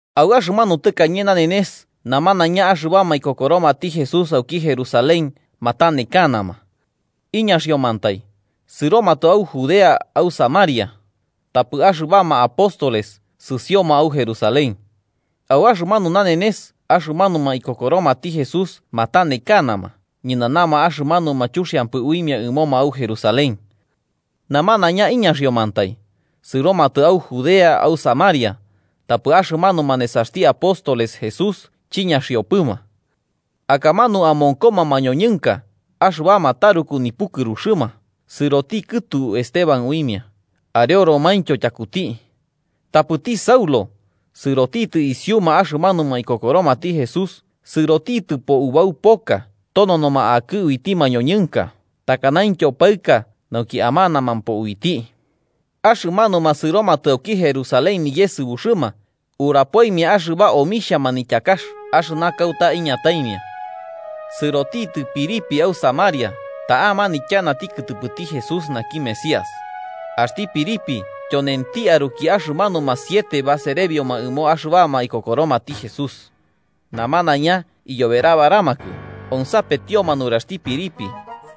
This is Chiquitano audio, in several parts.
Au axɨmanu tɨkañe nanenes namanaiña axɨbama ikokoromati Jesús auki Jerusalén matanekanama. Iñaxiomantai, sɨromatɨ au Judea au Samaria, tapɨ axɨbama apóstoles sɨsioma au Jerusalén. Au axɨmanu nanenes axɨmanuma ikokoromati Jesús matanekanama ñɨnanama axɨmanuma chuxiampɨ uimia ɨmoma au Jerusalén. Namanaiña iñaxiomantai, sɨromatɨ au Judea au Samaria, tapɨ axɨmanuma nesaxti apóstoles Jesús chiñaxipɨma. Akamanu amonkoma mañoñɨnka axɨbama taruku nipukɨruxɨma sɨroti kɨtu Esteban uimia, areoromaintyo tyakuti. Tapɨti Saulo, sɨrotitɨ isiuma axɨmanuma ikokoromati Jesús, sɨrotitɨpo ubau poka tononoma akɨ uiti mañoñɨnka takanaintyo paɨka nauki amanamampo uiti. Axɨmanuma sɨromatɨ auki Jerusalén niyesɨbuxɨma, urapoimia axɨba omixhia manityakax axɨna kauta iñataimia. Sɨrotitɨ Felipe au Samaria ta'a manityanati kɨtɨpɨti Jesús naki Mesías. Axti Felipe tyonenti aruki axɨmanuma siete baserebioma ɨmo axɨbama ikokoromati Jesús. Namanaiña iyoberabaramakɨ onsapetioma nuraxti Felipe,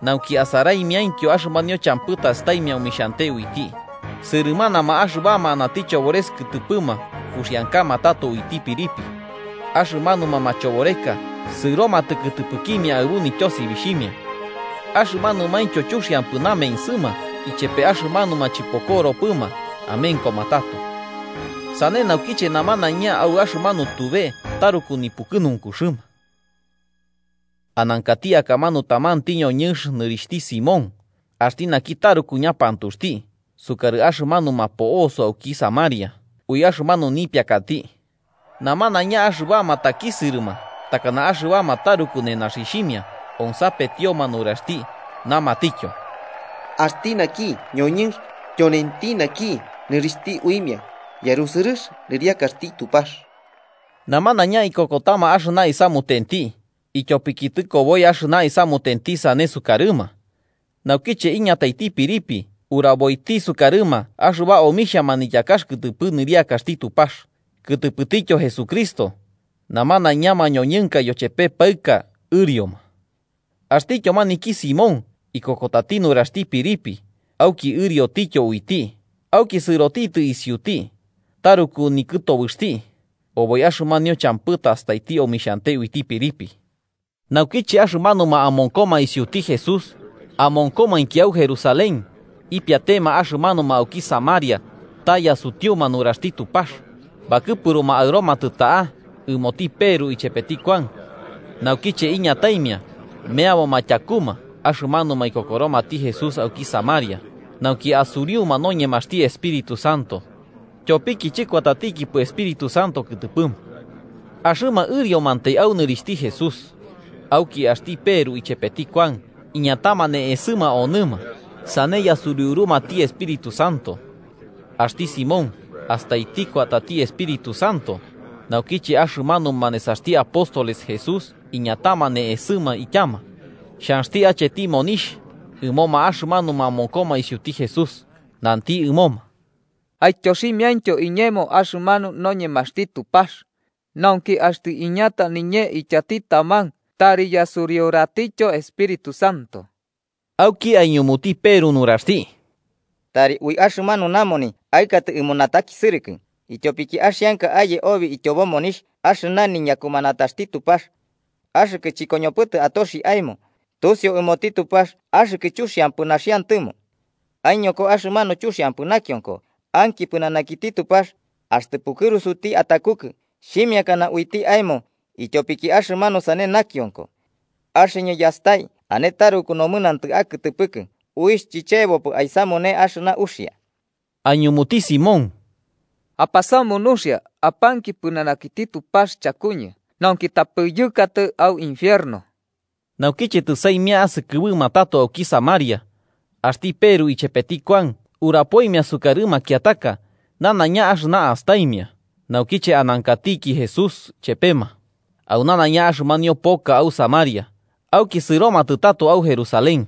nauki asaraimiaintyo axɨmanio champɨ tastaimia omixhante uiti. Sɨrɨmanama axɨbama anati chobores kɨtɨpɨma uxiankama tato uiti Felipe, axɨmanuma machoboreka sɨromatɨ kɨtɨpɨkimia aɨbu nityosibixhimia. Axɨmanumaintyo chuxiampɨ namensɨma ichepe axɨmanuma chɨpokoropɨma amenkoma tato. Sane naukiche namanaiña au axɨmanu tube taruku nipukɨnunkuxɨma. Anankati akamanu tamanti ñoñɨnx nɨrixhti Simón, axti naki taruku ñapantuxti sukarɨ axɨmanuma po'oso auki Samaria ui axɨmanu nipiakati. Namanaiña axɨbama takisɨrɨma takana axɨbama taruku nenaxixhimia onsapetioma nuraxti, namatityo: “Axti naki ñoñɨnx tyonenti naki nɨrixhti uimia ‘yarusɨrɨx nɨriakaxti Tupax.’” Namanaiña ikokotama axɨna isamutenti, ityopiki tɨkoboi axɨna isamutenti sane sukarɨma. Naukiche iñataiti Felipe uraboiti sukarɨma axɨba omixhia manityakax kɨtɨpɨ nɨriakaxti Tupax, kɨtɨpɨtityo Jesucristo, namanaiña mañoñɨnka yochepe paɨka ɨrioma. Axtityo maniki Simón ikokotati nuraxti Felipe auki ɨriotityo uiti, auki sɨrotitɨ isiuti, taruku nikɨtobɨxti oboi axɨmanio champɨ tastaiti omixhante uiti Felipe. Naukiche axɨmanuma amonkoma isiuti Jesús amonkomainki au Jerusalén ipiatema axɨmanuma auki Samaria ta yasutiuma nuraxti Tupax, bakɨpuruma aɨromatɨ ta'a ɨmoti Peru chepeti Kuan. Naukiche iñataimia, meaboma tyakuma axɨmanuma ikokoromati Jesús auki Samaria, nauki asuriuma noñemaxti Espíritu Santo. Tyopiki chɨkuatatikipɨ Espíritu Santo kɨtɨpɨma. Axɨma ɨriomantai au nɨrixhti Jesús. Auki axti Peru ichepeti Kuan iñatama ne'esɨma onɨma, sane yasuriurumati Espíritu Santo. Axti Simón, astaiti kuatati Espíritu Santo naukiche axɨmanuma nesaxti apóstol Jesús iñatama ne'esɨma ityama, xhanxti acheti monixh ɨmoma axɨmanuma amonkoma isiuti Jesús, nanti ɨmoma: –Aityoximiaintyo iñemo axɨmanu noñemaxti Tupax, nauki axtɨ iñata niñee ityati taman tari yasuriuratityo Espíritu Santo. Auki aiñumuti Peru nuraxti: –¡Tari ui axɨmanu namoni aɨkatɨ ɨmo natakisɨrɨkɨ, ityopiki axianka aye obi ityobo monixh axɨna niñakumanataxti Tupax! Axɨkɨ chɨkoñopɨtɨ atoxi aemo, tusiu ɨmoti Tupax axɨkɨ chuxiampɨ naxiantɨmo. Aiñoko axɨmanu chuxiampɨ nakionko, anki pɨnanakiti Tupax, axtɨ pukɨrusuti atakukɨ xhimiakana uiti aemo ityopiki axɨmanu sane nakionko. Axɨñɨ yastai ane taruku nomɨnantɨ akɨtɨpɨkɨ uixh chichebopɨ aisamune axɨna uxia. Aiñumuti Simón: –Apasamu nuxia, apanki pɨnanakiti Tupax chakuñɨ, nauki tapɨ yɨkatɨ au infierno. Naukiche tɨsaimia asɨkɨbɨma tato auki Samaria, axti Peru ichepeti Kuan urapoimia sukarɨ makiataka, nanaiña axɨna astaimia naukiche anankatiki Jesús chepema, au nanaiña axɨmanio poka au Samaria, auki sɨromatɨ tato au Jerusalén.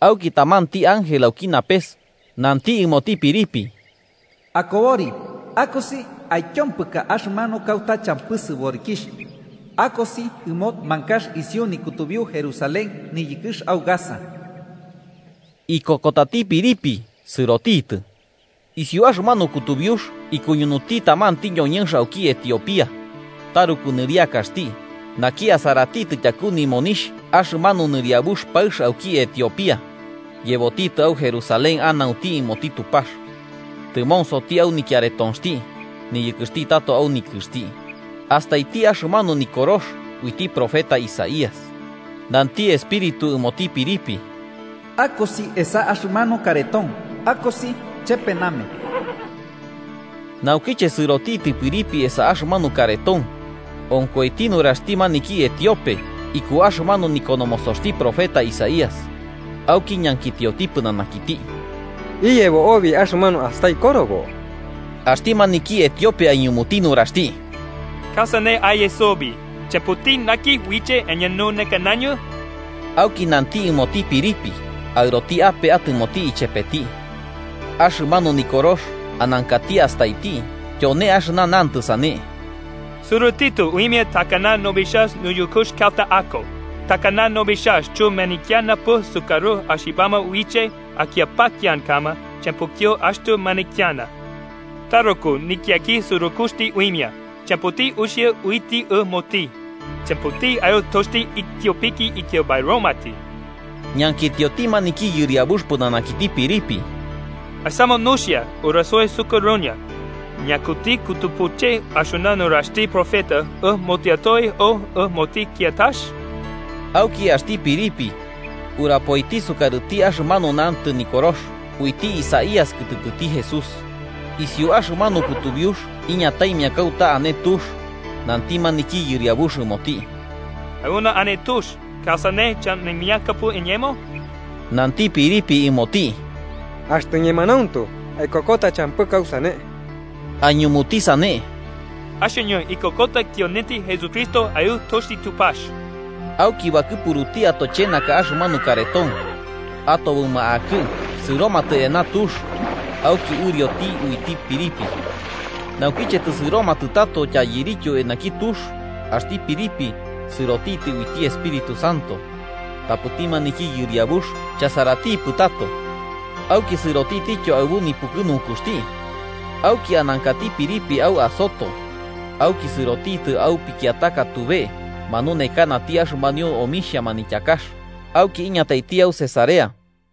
Auki tamanti ángel auki napes, nanti ɨmoti Felipe: “Akobori akosi aityompɨka axɨmanu kauta champɨ sɨborikixh, akosi ɨmo mankax isiu nikutubiu Jerusalén niyɨkɨx au Gaza.” Ikokotati Felipe Sɨrotitɨ. Isiu axɨmanu kutubiux ikuñunuti tamanti ñoñɨnx auki Etiopía. Taruku nɨriakaxti, naki asaratitɨ tyaku nimonixh axɨmanu nɨriabux paɨx auki Etiopía, yebotitɨ au Jerusalén anaunti ɨmoti Tupax. Tɨmonsoti au nikiaretonxti, niyɨkɨxti tato au nikɨxti, astaiti axɨmanu nikorox uiti profeta Isaías. Nanti Espíritu ɨmoti Felipe: “Akosi esa axɨmanu kareton akosi chepe name.” Naukiche sɨrotitɨ Felipe esa axɨmanu kareton, onkoiti nuraxti maniki etiope iku axɨmanu nikonomosoxti profeta Isaías. Auki ñankitioti pɨnanakiti: –¿Iyebo obi axɨmanu astai korobo? Axti maniki etiope aiñumuti nuraxti: –¿Kausane aye sobi, champɨti naki uiche aiñununekanañɨ? Auki nanti ɨmoti Felipe aɨroti ape atɨmoti ichepeti. Axɨmanu Nikorox anankati astaiti tyone axɨna nantɨ sane: “Sɨrotitɨ uimia takana nobixhax niyɨkɨx kauta ako. Takana nobixhax chɨmanityanapɨ sukarɨ axɨbama uiche aityapakiankama, champɨityo axtɨ manityana. Taruku nityakisɨrɨkɨxti uimia, champɨti uxia uiti ɨmoti. Champɨti aɨtoxti ityopiki ityabairomati.” Ñankitioti maniki yɨriabux pɨnanakiti Felipe: –Asamu nuxia, urasoi sukarɨñɨ, ¿ñakuti kɨtɨpɨche axɨna nuraxti profeta, ɨmotiatoe o ɨmoti kiatax? Auki axti Felipe, urapoiti sukarɨti axɨmanu nantɨ Nikorox uiti Isaías kɨtɨpɨti Jesús. Isiu axɨmanu kutubiux iñataimia kauta ane tux, nanti maniki yɨriabux ɨmoti. –Auna ane tux. ¿Kausane chaunimiakapɨ iñemo? Nanti Felipe ɨmoti: –Axtɨ ñemanauntu aikokota, champɨ kausane. Aiñumuti sane: –Axɨñɨ ikokota tyonenti Jesucristo Aɨtoxti Tupax. Auki bakɨpuruti atochenaka axɨmanu kareton. Atobɨma akɨ'ɨ sɨromatɨ eana tux, auki ɨrioti uiti Felipe. Naukiche tɨsɨromatɨ tato tyairityu eanaki tux, axti Felipe sɨrotitɨ uiti Espíritu Santo, tapɨti maniki yɨriabux chasaratipɨ tato. Auki sɨrotitityo aɨbu nipukɨnunkuxti. Auki anankati Felipe au Azoto, auki sɨrotitɨ au pikiataka tube manunekanati axɨmanio omixhia manityakax, auki iñataiti au Cesarea.